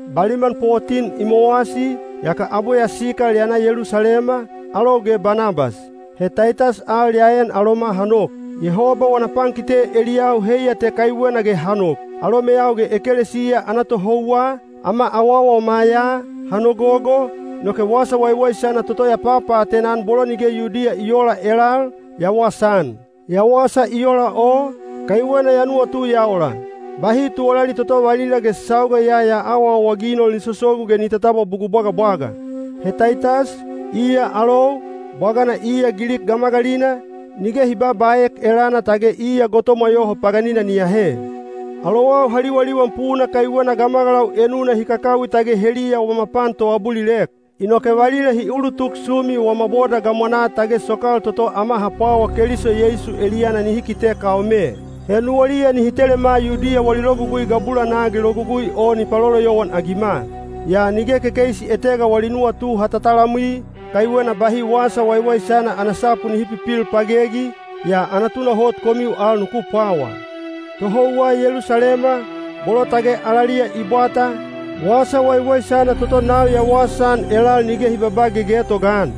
Baliman potin i mowasi, yaka abwe ya sikal ya na Yelusalema, alou ge Banabas. He Taitas al ya en aloma ha nok. Yehoba wana pankite eliyau heiya te kaiwena ge ha nok. Alomeyau ge ekelesiya ana tohouwa, ama awawama ya, ha nogogo, inoke wasa waiwaisana toto ya papaatena-an bolo nige Yudiya i oola elal, ya wasaan. Ya wasa i ola o, kaiwena ya nuwatu ya ola, “Bahi tuwalali toto valila ge sauga ya ya awaawaginol ni sosogu ge ni tatabwa bugul bwagabwaga.” (He Taitas, iya alou, bwagana iya Gilik gamagalina, nige hi babaaek elana tage iya gotomwa yoho paganina ni ahe.) Alowau ha liwaliwan puna kaiwena gamagalau enuna hi kakawi tage heliya wama pan toabulilek. Inoke valila hi ulutuk sumi wama boda gamwanaa tage sokal toto ama ha pwawa Keliso Yeisu eliyana nihi kite kaome. He nuwaliya nihi telema Yudiya wali logugui gabulanaa ge logugui o ni paloloyowan-agima. Yaa nige kekeisi etega wali nuwatu ha tatalamwi, kaiwena bahi wasa waiwaisana ana sapu nihi pipil pagegi, yaa ana tunahot komiu al nuku pwawa. Tohouwa Yelusalema, bolo tage alaliya i bwata, wasa waiwaisana toto nau ya wasaan elal nige hi babaa gegetoga-an.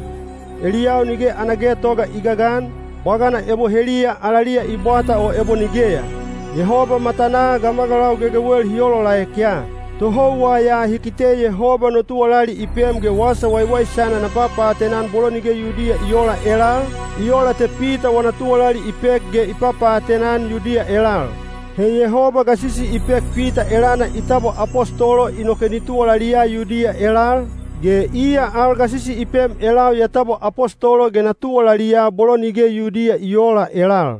(Eliyau nige ana getoga i gagan, bwagana ebo heliya alaliya i bwata o ebo nigeya. Yehoba matanaa gamagalau gegewel hi olaolaek ya.) Tohouwa ya hi kite Yehoba no tuwalali i pem ge wasa waiwaisana na papaatena-an bolo nige Yudiya i oola elal, i ola te Pita wana tuwalali i pek ge i papaatena-an Yudiya elal. He Yehoba gasisi i pek Pita elana i tabwa apostolo inoke ni tuwalaliya Yudiya elal, ge iya al gasisi i pem elau ya tabwa apostolo ge na tuwalaliya bolo nige Yudiya i oola elal.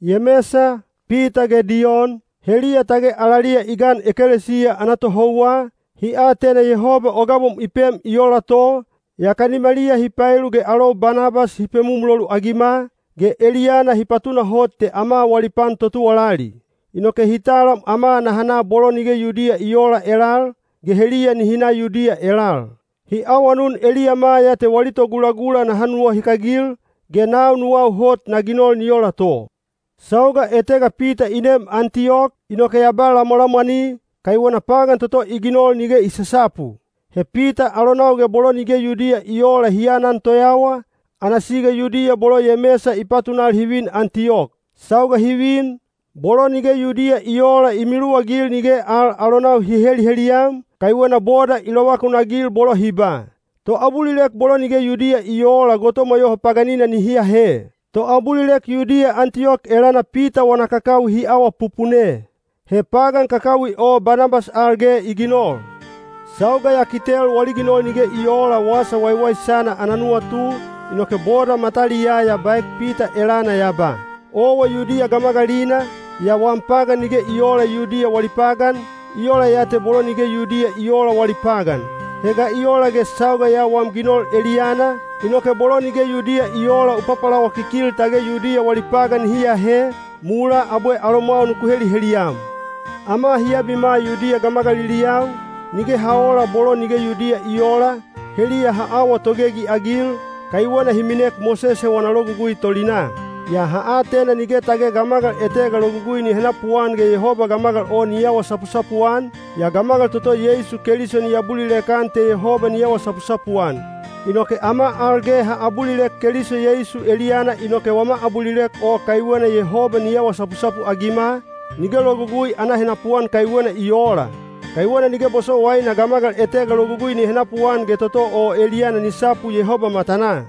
Yemesa, Pita ge Diyon, heliya tage alaliya i gan ekelesiya ana tohouwa, hi atena Yehoba o gabom i pem i ola to, yaka nimaliya hi paelu ge alou Banabas hi pemumulolu-agima, ge eliyana hi patunahot te ama wali pan totuwalali. Inoke hi talam ama naha na bolo nige Yudiya i oola elal, ge heliya nihi na Yudiya elal. Hi awanun eliyama ya te wali togulagula naha nuwahikagil, ge nau nuwau hot na ginol ni ola to. Sauga etega Pita i nem Antiyok, inoke ya ba lamwalamwani, kaiwena pagan toto i ginol nige i sasapu. He Pita alonau ge bolo nige Yudiya i oola hi anan toyawa, ana siga Yudiya bolo Yemesa i patunal hi vin Antiyok. Sauga hi vin, bolo nige Yudiya i oola i miluwagil nige al alonau hi heliheliyam, kaiwena boda i lovakunagil bolo hi ba, “Toabulilek bolo nige Yudiya i oola gotomwa yoho paganina nihi ahe.” Toabulilek Yudiya Antiyok elana Pita wana kakawi hi awapupune. He pagan kakawi o Banabas al ge i ginol. Sauga ya kitel wali ginol nige i oola wasa waiwaisana ana nuwatu, inoke boda mataliyaa ya baek Pita elana ya ba, “Owa Yudiya gamagalina, yaa wam pagan nige i oola Yudiya wali pagan, i ola ya te bolo nige Yudiya i oola wali pagan. He ga i ola ge sauga ya wam ginol eliyana, inoke bolo nige Yudiya i oola u papalawakikil tage Yudiya wali pagan nihi ahe, mulaa abwe alomwau nuku heliheliyam?” Ama hi abima Yudiya gamagaliliyau, nige ha oola bolo nige Yudiya i oola, heliya ha awa togegi-agil, kaiwena hi minek Mosese wana Logugui tolinaa. Yaa ha atena nige tage gamagal etega logugui ni henapuan ge Yehoba gamagal o ni awa sapusapuan, yaa gamagal toto Yeisu Keliso ni abulilek-an te Yehoba ni awa sapusapu-an. Inoke ama al ge ha abulilek Keliso Yeisu eliyana inoke wama abulilek o kaiwena Yehoba ni awa sapusapu-agima, nige logugui ana henapuan kaiwena i oola. Kaiwena nige bosowaina gamagal etega logugui ni henapuan ge toto o eliyana ni sapu Yehoba matanaa.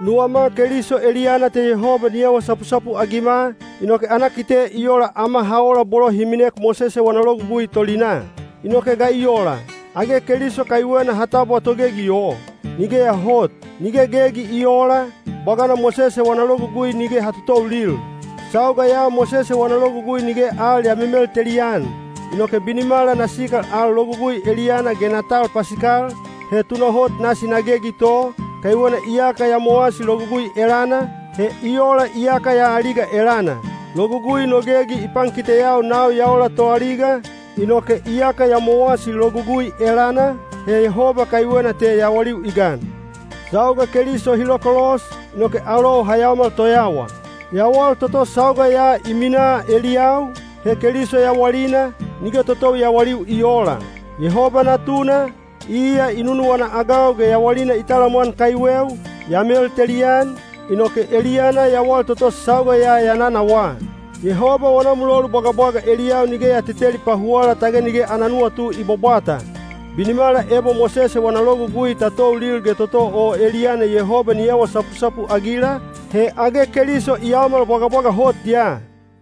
Nuwama Keliso eliyana te Yehoba ni awa sapusapu-agima, inoke ana kite i ola ama ha ola bolo hi minek Mosese wana Logugui tolinaa. Inoke ga i ola? Age Keliso kaiwena ha tabwa togegi o? Nigeya hot! Nige gegi i oola, bwagana Mosese wana Logugui nige ha totoulil. Sauga ya Mosese wana Logugui nige al ya memelteli-an. Inoke binimala na sikal al Logugui eliyana ge na tal pasikal, he tunahot nasi na gegi to, kaiwena iyaka ya mowasi logugui elana, he i ola iyaka ya aliga elana. Logugui no gegi i pankiteyau nau ya ola toaliga, inoke iyaka ya mowasi logugui elana, he Yehoba kaiwena te yawaliu i gan. Sauga Keliso hi lokolos, inoke alou ha yaomal toyawa. Yawal toto sauga ya i minaa eliyau, he Keliso yawalina, nige totou yawaliu i oola. Yehoba Natuna, iya i nunuwana-agau ge yawalina i talamwan kaiweu, ya meltelian, inoke eliyana yawal toto sauga ya ya nanawaa. Yehoba wana mulolu bwagabwaga eliyau nige ya teteli pahuwala tage nige ana nuwatu i bwabwata. Binimala ebo Mosese wana Logugui ta toulil ge toto o eliyana Yehoba ni awa sapusapu-agila, he age Keliso i yaomal bwagabwaga hot ya!